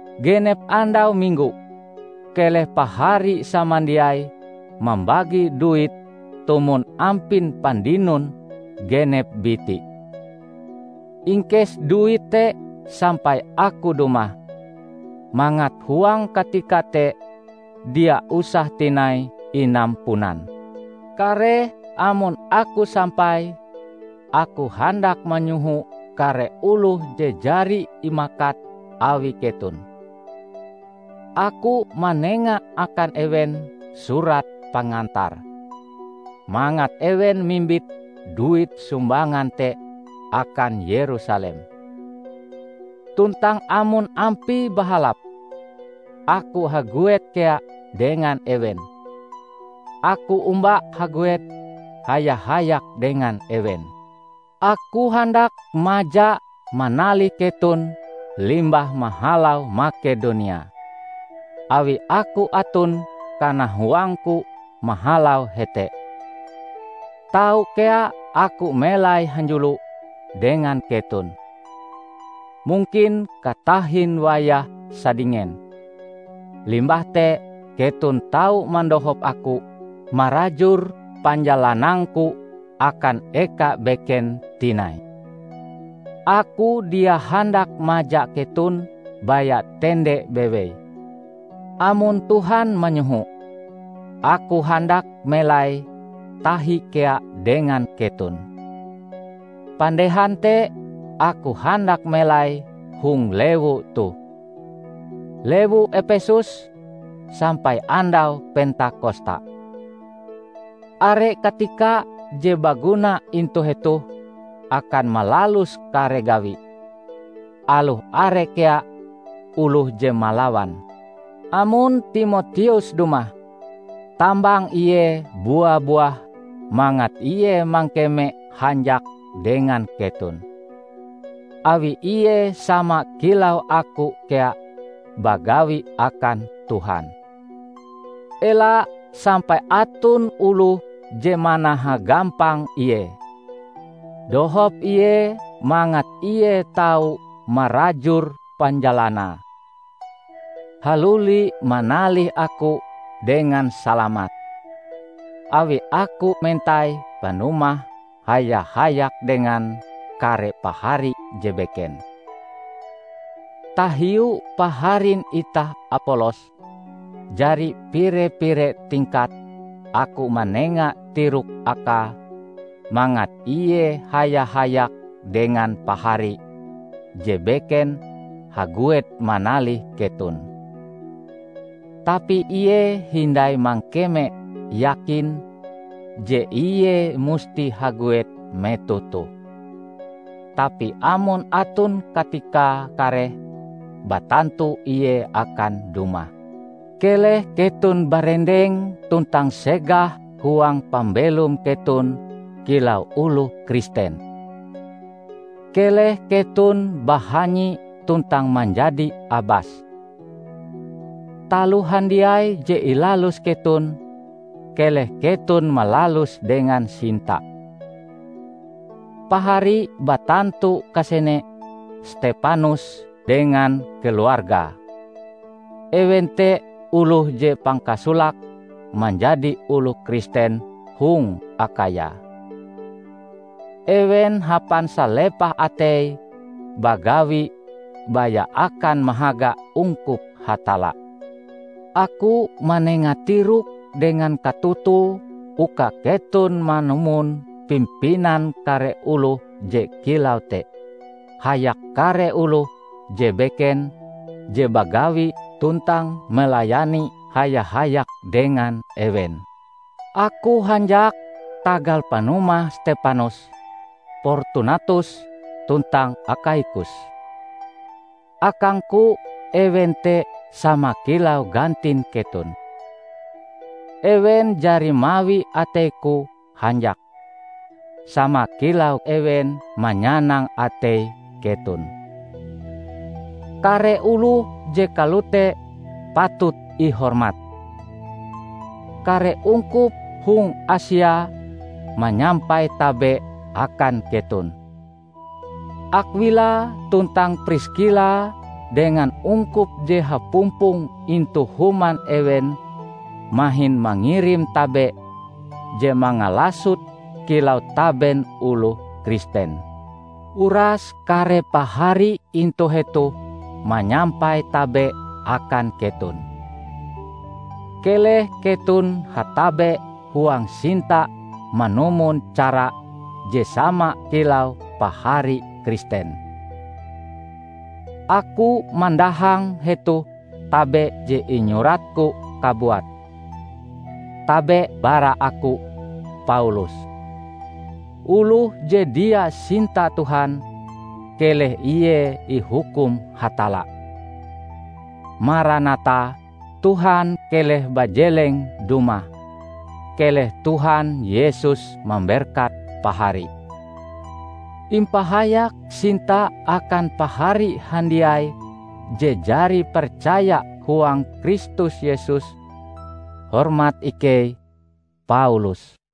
Genep andau Minggo, keleh pahari samandiai mambagi duit tumon ampin pandinon genep biti. Ingkes duit te sampai aku dumah, mangat huang katika te dia usah tinai inampunan. Kareh amon aku sampai, aku handak manyoho kare oloh je jari imakat awi keton. Aku manenga akan ewen surat pengantar, mangat ewen mimbit duit sumbangan te akan Yerusalem. Tuntang amon ampie bahalap, aku haguet kea dengan ewen, aku omba haguet haya-hayak dengan ewen. Aku handak maja manalih keton limbah mahalau Makedonia, awi aku aton kanahuangku mahalau hete. Tau kea aku melai hanjulo dengan keton, mungkin katahin wayah sadingen. Limbah te keton tau mandohop aku marajur panjalanangku akan eka beken tinai. Aku dia handak maja keton baya tende bewei. Amon Tuhan manyoho, aku handak melai tahi kea dengan keton. Pandehan te aku handak melai hong lewu toh, lewu Epesus, sampai andau Pentakosta. Are katika je baguna intu hetoh akan malalus kare gawi, aloh are kea oloh je malawan. Amon Timoteus dumah, tambang ie bua-buah mangat ie mangkeme hanjak dengan keton, awi ie sama kilau aku kea bagawi akan Tuhan. Ela sampai aton oloh je manahagampang ie. Dohop ie mangat ie tau marajur panjalanae haluli manalih aku dengan salamat, awi aku mentai panumahe haya-hayak dengan kare pahari je beken. Tahiu paharin itah Apolos, jari pire-pire tingkat aku manenga tirok akae mangat ie haya-hayak dengan pahari je beken haguet manalih keton. Tapi ie hindai mangkeme yakin je ie musti haguet metoh toh. Tapi amon aton katikae kareh, batantu ie akan dumah. Keleh keton barendeng tuntang segah huang pambelom keton kilau oloh Kristen. Keleh keton bahanyi tuntang manjadi abas. Taloh handiai je ilalus keton, keleh keton malaluse dengan sinta. Pahari batantu kasene Stepanus dengan keluargae; ewen te oloh je pangkasolake manjadi oloh Kristen hong Akhaya. Ewen hapan salepah ateie bagawi baya akan mahaga ungkup Hatalla. Aku manenga tirok dengan katotoe uka keton manumon pimpinan kare oloh je kilau te, hayak kare oloh je beken je bagawi tuntang melayani haya-hayak dengan ewen. Aku hanjak tagal panumah Stepanus, Portunatus tuntang Akhaikus. Akangku ewen te sama kilau gantin keton. Ewen jari mawi ateiku hanjak, sama kilau ewen manyanang atei keton. Kare oloh je kalote patut ihormat. Kare ungkup hong Asia manyampai tabe akan keton. Akwila tuntang Priskila dengan ungkup je hapumpong intu human ewen mahin mangirim tabe je mangalasot kilau taben oloh Kristen. Uras kare pahari intu hetoh manyampai tabe akan keton. Keleh keton hatabe huang sinta manumon cara je sama kilau pahari Kristen. Aku mandahang hetoh tabe je inyuratku kabuat: Tabe bara aku, Paulus. Oloh je dia sinta Tuhan, keleh ie ihukum Hatalla! Maranatha -- Tuhan keleh bajeleng dumah! Keleh Tuhan Yesus mamberkat pahari. Impahayak sinta akan pahari handiai je jari percaya huang Kristus Yesus. Hormat ikei, Paulus